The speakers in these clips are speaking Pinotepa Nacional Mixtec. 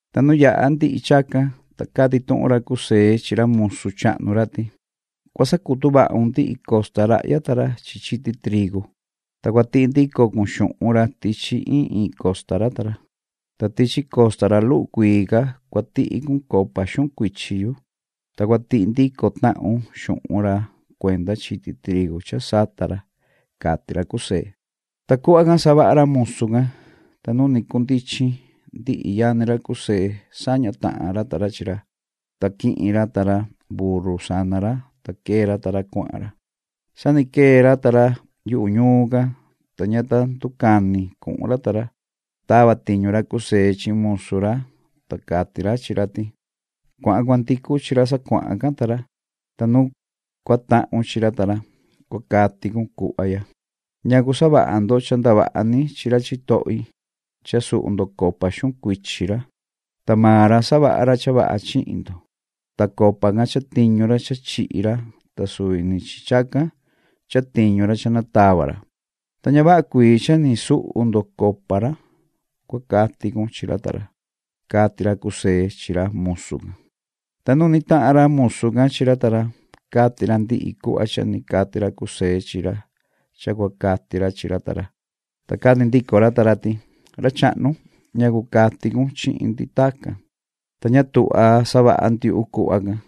Ta nu yaha ndihi chacan, ta cati tuhun ra José chi ra musu chahnu ra ti: ―Cua sacutu vahun ndihi costa rahya ta ra chi chiti trigu, ta cua tihi ndico cun xuhun ra tichi iin iin costa ra ta ra. Ta tichi costa ra luhu cuii ca cua tihi cun copa xuhun cuichi yu, ta cua tihi ndico tahun xuhun ra cuenda chiti trigu cha sata ra ―cati ra José. Ta cuhva can savaha ra musu can. Ta nu ni cundichin, ndihi yani ra José saña tahan ra ta ra chi ra, ta quihin ra ta ra burru sana ra, ta quee ra ta ra cuahan ra. Sa ni quee ra ta ra yuhu ñuun can, ta ña ta nducani cuhun ra ta ra, ta tava tiñu ra José chi musu ra, ta cati ra chi ra ti: ―Cuahan cua ndicu chi ra sa cuahan can ta ra, ta nu cua tahun chi ra ta ra, cua cati cun cuhva ya: ‘¿Ñacu savaha ndo cha ndavaha ni chi ra chitohi, cha suhu ndo copa xuhun cuichi ra?, ta maan ra, savaha ra cha vaha chihin ndo. Ta copa can chatiñu ra cha chihi ra, ta suvi ni chacan chatiñu ra cha natava ra. Ta ña vaha cuii cha ni suhu ndo copa ra’, cua cati cun chi ra ta ra ―cati ra José chi ra musu can. Ta nu ni tahan ra musu can chi ra ta ra, cati ra ndihi cuhva cha ni cati ra José chi ra cha cua cati ra chi ra ta ra. Ta cati ndico ra ta ra ti: ―¿Ra chahnu, ñacu cati cun chihin ndi tacan? Ta ña tuhva savaha ndiuhu cuhva can.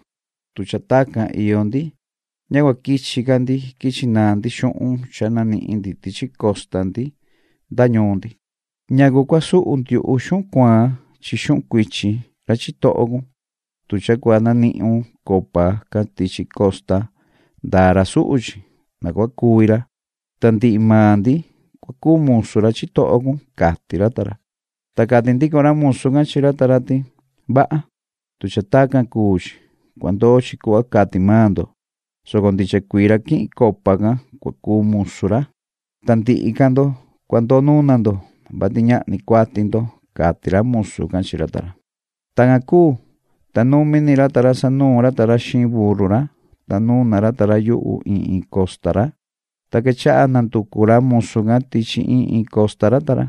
Tu cha tacan iyo ndi, ña cua quichi ca ndi quichi naan ndi xuhun cha nanihin ndi tichi costa ndi nda ñuun ndi. ¿Ñacu cua suhu ndiuhu xuhun cuaan chi xuhun cuichi ra chitoho cun? Tu cha cua nanihun copa can tichi costa, ndaa ra suhu chi, na cua cuvi ra, ta ndihi maan ndi cua cuu musu ra chitoho cun ―cati ra ta ra. Ta cati ndico ra musu can chi ra ta ra ti: ―Vaha, tu cha tacan cuu chi. Cua ndoo chi cuhva cati maan ndo, soco ndicha cuii ra quihin copa can cua cuu musu ra, ta ndihi ca ndo cua ndoo nuna ndo, vati ñahni cuati ndo ―cati ra musu can chi ra ta ra. Tacan cuu, ta numi ni ra ta ra sanuun ra ta ra xiin burru ra, ta nuna ra ta ra yuhu iin iin costa ra. Ta quechaha nanducu ra musu can tichi iin iin costa ra ta ra.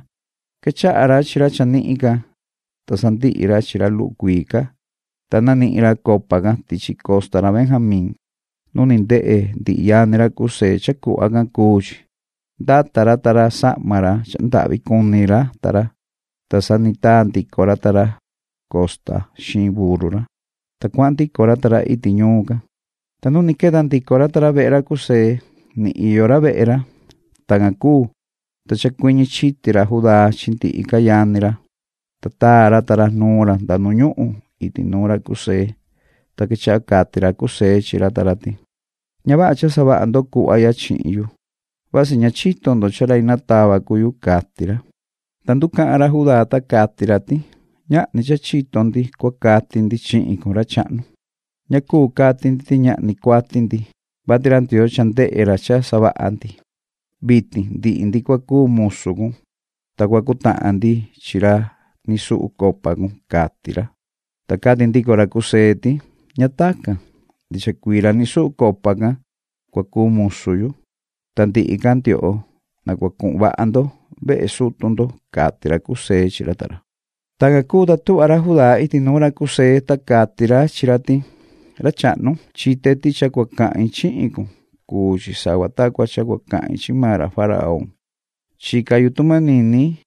Quechaha ra chi ra chanihin ca, ta sandihi ra chi ra luhu cuii ca, ta nanihin ra copa can tichi costa ra Benjamín. Nu ni ndehe ndihi yani ra José cha cuhva can cuu chi, ndata ra ta ra sahma ra cha ndahvi cuni ra ta ra, ta sa ni taa ndico ra ta ra costa xiin burru ra, ta cuahan ndico ra ta ra iti ñuun can. Ta nu ni queta ndico ra ta ra vehe ra José, ni iyo ra vehe ra. Tacan cuu, ta chacuiñi chiti ra Judá chi ndihi ca yani ra, ta taa ra ta ra nuun ra nda nu ñuhun iti nuun ra José. Ta quechaha cati ra José chi ra ta ra ti: ―Ña vaha cha savaha ndo cuhva ya chihin yu. Vasi ña chito ndo cha rai natava cuu yu ―cati ra. Ta nducahan ra Judá, ta cati ra ti: ―Ñahni cha chito ndi cua cati ndi chihin cun, ra chahnu. Ña cuu cati ndi cha ñahni cuati ndi, vati ra Ndioo cha ndehe ra cha savaha ndi. Vitin ndihi ndi cua cuu musu cun, ta cua cutahan ndihi ndi chi ra ni suhu copa cun ―cati ra. Ta cati ndico ra José ti: ―Ña tacan. Ndicha cuii ra ni suhu copa can cua cuu musu yu. Ta ndihi ca ndioho, na cua cuhun vaha ndo vehe sutu ndo ―cati ra José chi ra ta ra. Tacan cuu, ta tuhva ra Judá iti nuun ra José, ta cati ra chi ra ti: ―Ra chahnu, chite ti cha cua cahin chihin cun, cuu chi sava ta cua cha cua cahin chi maan ra faraón. Chica yu tu manini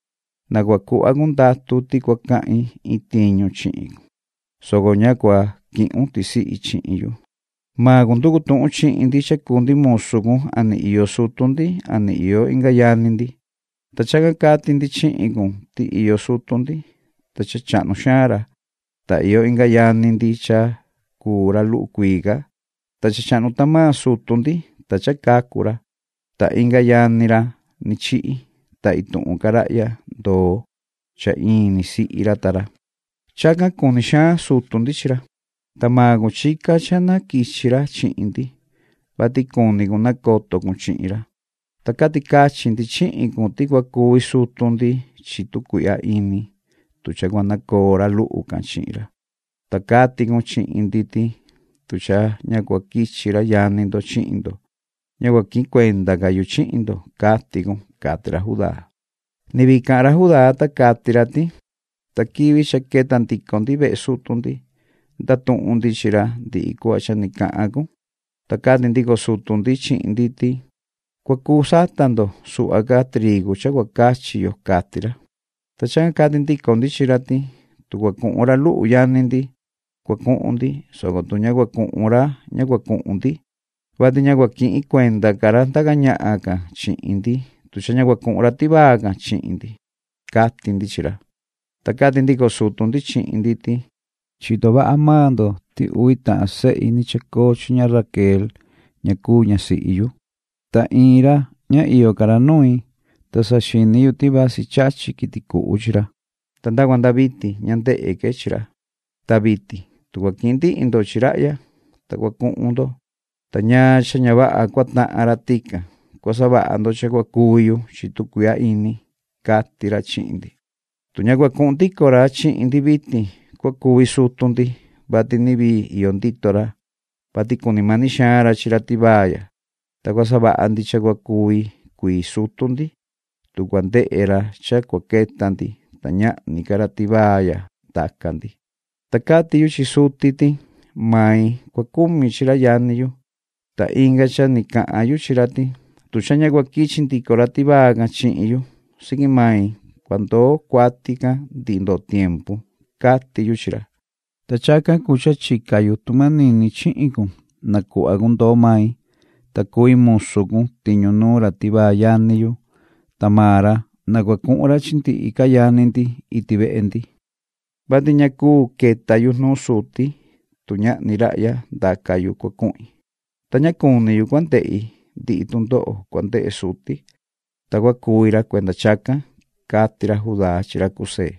na cua cuhva cun ndatu ti cua cahin iin tiñu chihin cun, soco ña cua quihun tisihi chihin yu. Maan cun nducu tuhun chihin ndi cha cuu ndi musu cun a ni iyo sutu ndian iyo inga yani ndi. Ta chacan cati ndi chihin cun ti iyo sutu ndi, ta cha chahnu xaan ra, ta iyo inga yani ndi cha cuu ra luhu cuii ca, ta cha chahnu tahan maan sutu ndi, ta cha cacu ra, ta inga yani ra ni chihi, ta ituhun ca rahya ndoo cha in ni sihi ra ta ra, ta chacan cuni xaan sutu ndi chi ra. Ta maan cun chica cha na quichi ra chihin ndi, vati cuni cun nacoto cun chihin ra. Ta cati cachi ndi chihin cun ti cua cuvi sutu ndi chi tu cuihya ini, tu cha cua nacoo ra luhu can chi ra. Ta cati cun chihin ndi ti: “Tu cha ña cua quichi ra yani ndo chihin ndo, ña cua quihin cuenda ca yu chihin ndo”, cati cun ―cati ra Judá. Ni vii cahan ra Judá, ta cati ra ti: ―Ta quivi cha queta ndico ndi vehe sutu ndi, ndatuhun ndi chi ra ndihi cuhva cha ni cahan cun. Ta cati ndico sutu ndi chihin ndi ti: ‘Cua cu sata ndo suhva ca trigu cha cua cachi yo’, cati ra. Ta chacan cati ndico ndi chi ra ti: ‘Tu cua cuhun ra luhu yani ndi, cua cuhun ndi, soco tu ña cua cuhun ra ña cua cuhun ndi, vati ña cua quihin cuenda ca ra ndaca ñahan can chihin ndi, tu cha ña cua cuhun ra tivaa can chihin ndi’, cati ndi chi ra. Ta cati ndico sutu ndi chihin ndi ti: ‘Chito vaha maan ndo ti uvi tahan sehi ni chacoo chi ña Raquel ña cuu ñasihi yu. Ta iin ra ña iyo ca ra nui, ta saxini yu ti vasi chachi quiti cuhu chi ra, ta nda cua nda vitin ña ndehe que chi ra. Ta vitin, tu cua quihin ndihi ndo chi rahya, ta cua cuhun ndo, ta ñaan cha ña vaha cua tahan ra tican, cua savaha ndo cha cua cuvi yu chi tu cuihya ini’, cati ra chihin ndi. “Tu ña cua cuhun ndico ra chihin ndi vitin, cua cuvi sutu ndi, vati ni vii iyo ndito ra, vati cuni mani xaan ra chi ra tivaa ya. Ta cua savaha ndi cha cua cuvi cuii sutu ndi, tu cua ndehe ra cha cua queta ndi, ta ñahni ca ra tivaa ya ndaca ndi. Ta cati yu chi suti ti: ‘Main cua cumi chi ra yani yu, ta inga cha ni cahan yu chi ra ti: ‘Tu cha ña cua quichi ndico ra tivaa can chihin yu, siqui mai cua ndoo cuati can ndihi ndoo tiempu’, cati yu chi ra. Ta chacan cuu cha chica yu tu manini chihin cun, na cuhva cun ndoo mai, ta cui musu cun tiñu nuun ra tivaa yani yu, ta maan ra, na cua cuhun ra chi ndihi ca yani ndi iti vehe ndi, vati ña cuu queta yu nuun suti, tu ñahni rahya ndaca yu cua cuhin. Ta ña cuni yu cua ndehi ndihi tundoho cua ndehe suti, ta cua cuvi ra cuenda chacan ―cati ra Judá chi ra José.